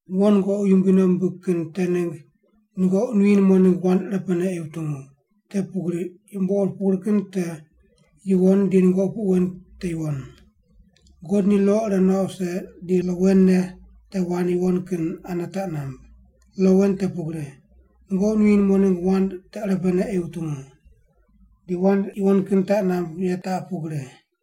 Wo nungoqi Yumbui nei wumbig kin te ningg nungoqi nuyi numo ningg wand irepene ei wutungu, te pugri yumbo ur pugri kin te yuwon di nungoqi puq wen te yuwon. God ni lo ire nuaq wuse di lo wen ne te wand yuwon kin ane taq namb. Lo wen te pugri, “Nungoqi nuyi numo ningg wand te irepene ei wutungu.” Di wand yuwon kin taq namb ye taq pugri: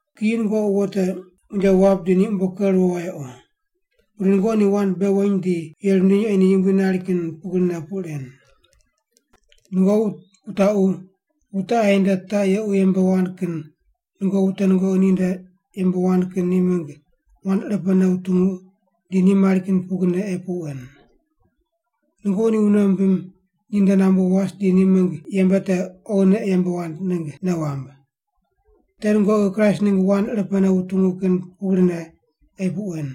Kiyi nungoqi wo te unje wap di ni umbo ker ruwo wayequ. Pudi nungoqi ni wand bei weny di yeri wundiny ei ni Yumbui nari kin pugrine puq ren. Nungoqi wutaqu wute aye nde taq yequ yembe wand kin nungoqi wute nungoqi ninde yembe wand kin ni mingg wand irepene wutungu di ni mari kin pugrine ei puq wen. Nungoqi ni wune wumbim ninde nambu was di ni mingg yembe te oghine ei yembe wand ningg nei wamb. Te nungoqi Kraist ningg wand irepene wutungu kin pugrine ei puq wen.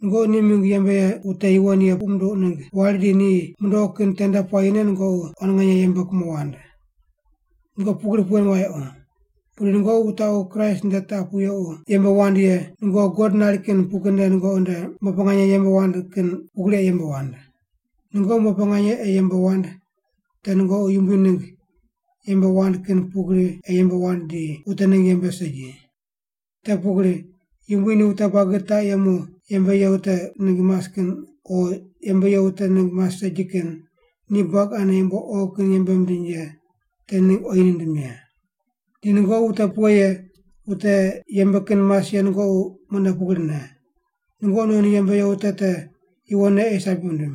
Nungoqi ni mingg yembe ye wute yuwon ye puq munduq ningg wari di ni mundoqu kin tende puayi nungoqi quan nganye yembe kumo wand. Nungoqi pugri puq wen wayequ, pudi nungoqi wutaqu Kraist nde taq pu yequ yembe wand ye nungoqi God nari kin pugrine nungoqi nde umbo pe nganye yembe wand kin pugri ei yembe wand. Nungoqi umbo pe nganye ei yembe wand te nungoqi Yumbui ningg yembe wand kin pugri ei yembe wand di wute ningg yembe segi. Te pugri Yumbui ni wute buagi taq yemu yembe ye wute ningg mas kin o yembe ye wute ningg mas segi kin ni buagi ane yumbo oghi kin yembe mindiny ye te ningg oyi nindim ye. Di nungoqi wute pughe ye wute yembe kin mas ye nungoqi mune pugrine, nungoqi non yembe ye wute te yuwonne ei sabi wundim.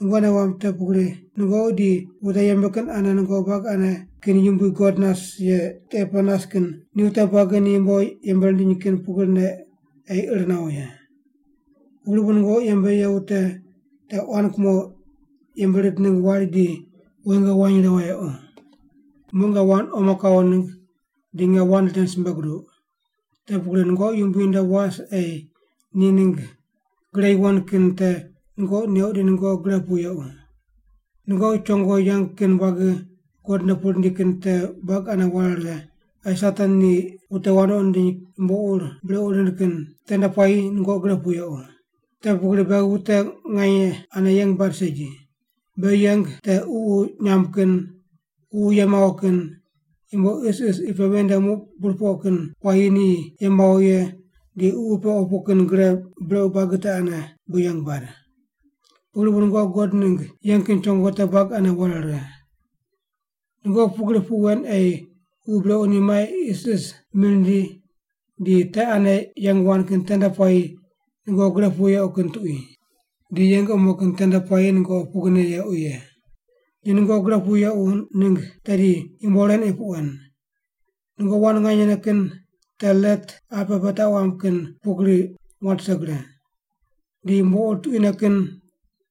Nungoqi nei wamb te pugri nungoqi di wute yembe kin ane nungoqi buagi ane kin yumbui God nas ye tiqe pe nas kin ni wute buagi ni yumbo yembe rindiny kin pugrine ei ir nawo ye. Pugri bu nungoqi yembe ye wute te quan kumo yembe rind ningg wari di woingo wany righe wayequ. Muq nge wand omo kawo ningg di nge wand ren simbe guduq. Te pugri nungoqi Yumbui nde was ei ni ningg gre yuwon kin te nungoqi neuq di nungoqi gre pu yequ. Nungoqi chongo yeng kin buagi God nde pu rindi kin te buagi ane ware righe ei Satan ni wute wandoqi nindiny yumbo ur brequ rind kin tende puayi nungoqi gre pu yequ. Te pugri beghi wute nganye ane yeng bad segi. Beghi yeng te ququ nyamb kin, ququ ye mawo kin, yumbo isis qi pe ven nde muq burpoq kin puayi ni ye mawo ye di ququ pe opu kin gre brequ kin buagi te ane bu yeng bad. Pugri bu nungoqi God ningg yeng kin chongo te buagi ane ware righe. Nungoqi pugri puq wen ei ququ brequ ni mai isis mi rindi di te ane yeng wand kin tende puayi nungoqi gre pu yequ kin tuqui. Di yeng omo kin tende puayi nungoqi pugrine yequ ye. Di nungoqi gre pu yequ ningg tedi yumbo ren ei puq wen: Nungoqi wand nganyene kin te let apqe pe taq mamb kin pugri wat rise gre. Di yumbo ur tuquine kin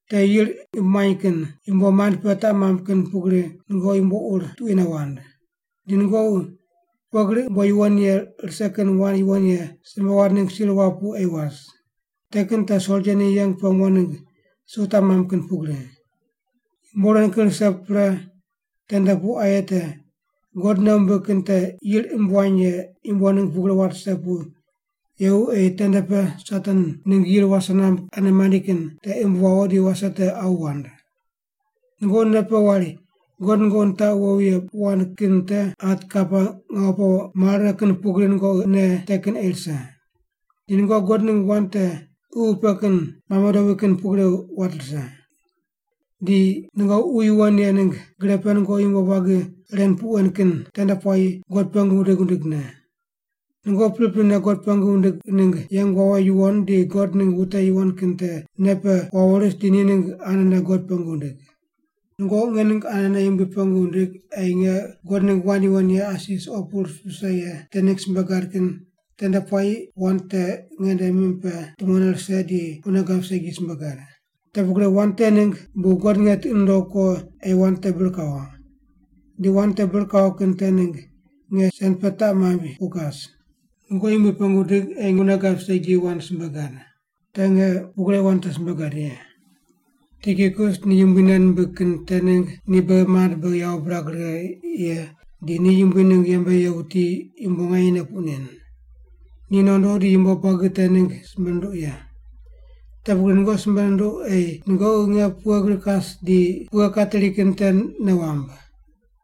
te yir imb muany kin yumbo mand pe taq mamb kin pugri nungoqi yumbo ur tuquine wand. Di nungoqi pughe gri umbo yuwon ye rise kin wand yuwon ye simbe wand ningg sir wap pu ei was. Te kin te soldia ni yeng pe mo ningg su taq mamb kin pugri. Yumbo ren kin rise pre tende pu aye te, God nei wumbig kin te yir imb wany ye yumbo ningg pugri wat rise pu yequ ei tende pe Satan ningg yir wase namb ane mandi kin te imb wawo di wase te awu wand. Nungoqi nei pe wari God nungoqi nitaqu wowi ye puq wand kin te hat kapa ngawu pe mare righe kin pugri nungoqi nei te kin ei rise. Di nungoqi God ningg wand te Ququ pe kin mame dobui kin pugri wat rise. Di nungoqi Ququ Yuwon Ye ningg gre pe nungoqi yumbo buagi ren puq wen kin tende puayi God pengu wundig wundigne. Nungoqi priprine God pengu wundig ningg yeng wawo yuwon di God ningg wute yuwon kin te nei pe wawo ris di ni ningg anene God pengu wundig. Nungoqi nge ningg anene Yumbui pengu wundig ei nge God ningg wand yuwon ye asi suqo pu vise ye te ningg simbe gad kin tende puayi wand te ngende mim pe tumone rise di wune gab segi simbe gad. Te pugri wand te ningg bu God nge tiqi nundogh ko ei wand te bir kawo. Di wand te bir kawo kin te ningg nge sen pe taq maimb pu kas. Nungoqi Yumbui pengu wundig ei wune gab segi wand te simbe gad. Te nge pugri ei wand te simbe gad ye. Tikikus ni Yumbui nei nimbig kin te ningg ni beghi mand beghi yawo birag righe ye di ni Yumbui ningg yembe ye wuti yumbo nyanyene puq nen. Ni nondo di yumbo buagi te ningg simbe nunduq ye. Te pugri nungoqi simbe nunduq ei nungoqi nge pughe gri kas di pughe kateri kin te nei wamb.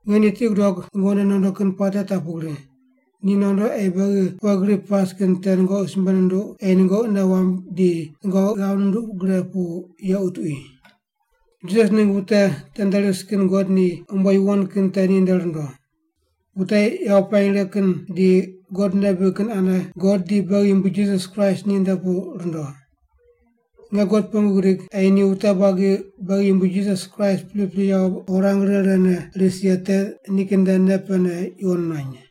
Nge ni tiqi gudog nungoqi nde nondo kin puate taq pugri, ni nondo ei beghi pughe gri pas kin te nungoqi simbe nunduq ei nungoqi nei wamb di nungoqi ghav nunduq gre pu yequ tuqui. Jisas ningg wute tende ris kin God ni umbo yuwon kin te ninde rundo. Wute yawo pirany righe kin di God nei bibig kin ane God di beghi Yumbui Jisas Kraist ninde pu rundo. Nge God pengu gidig ei ni wute buagi beghi Yumbui Jisas Kraist pripri yawo rirang righe righene ris ye te nikin nde nei pene yuwon nuany.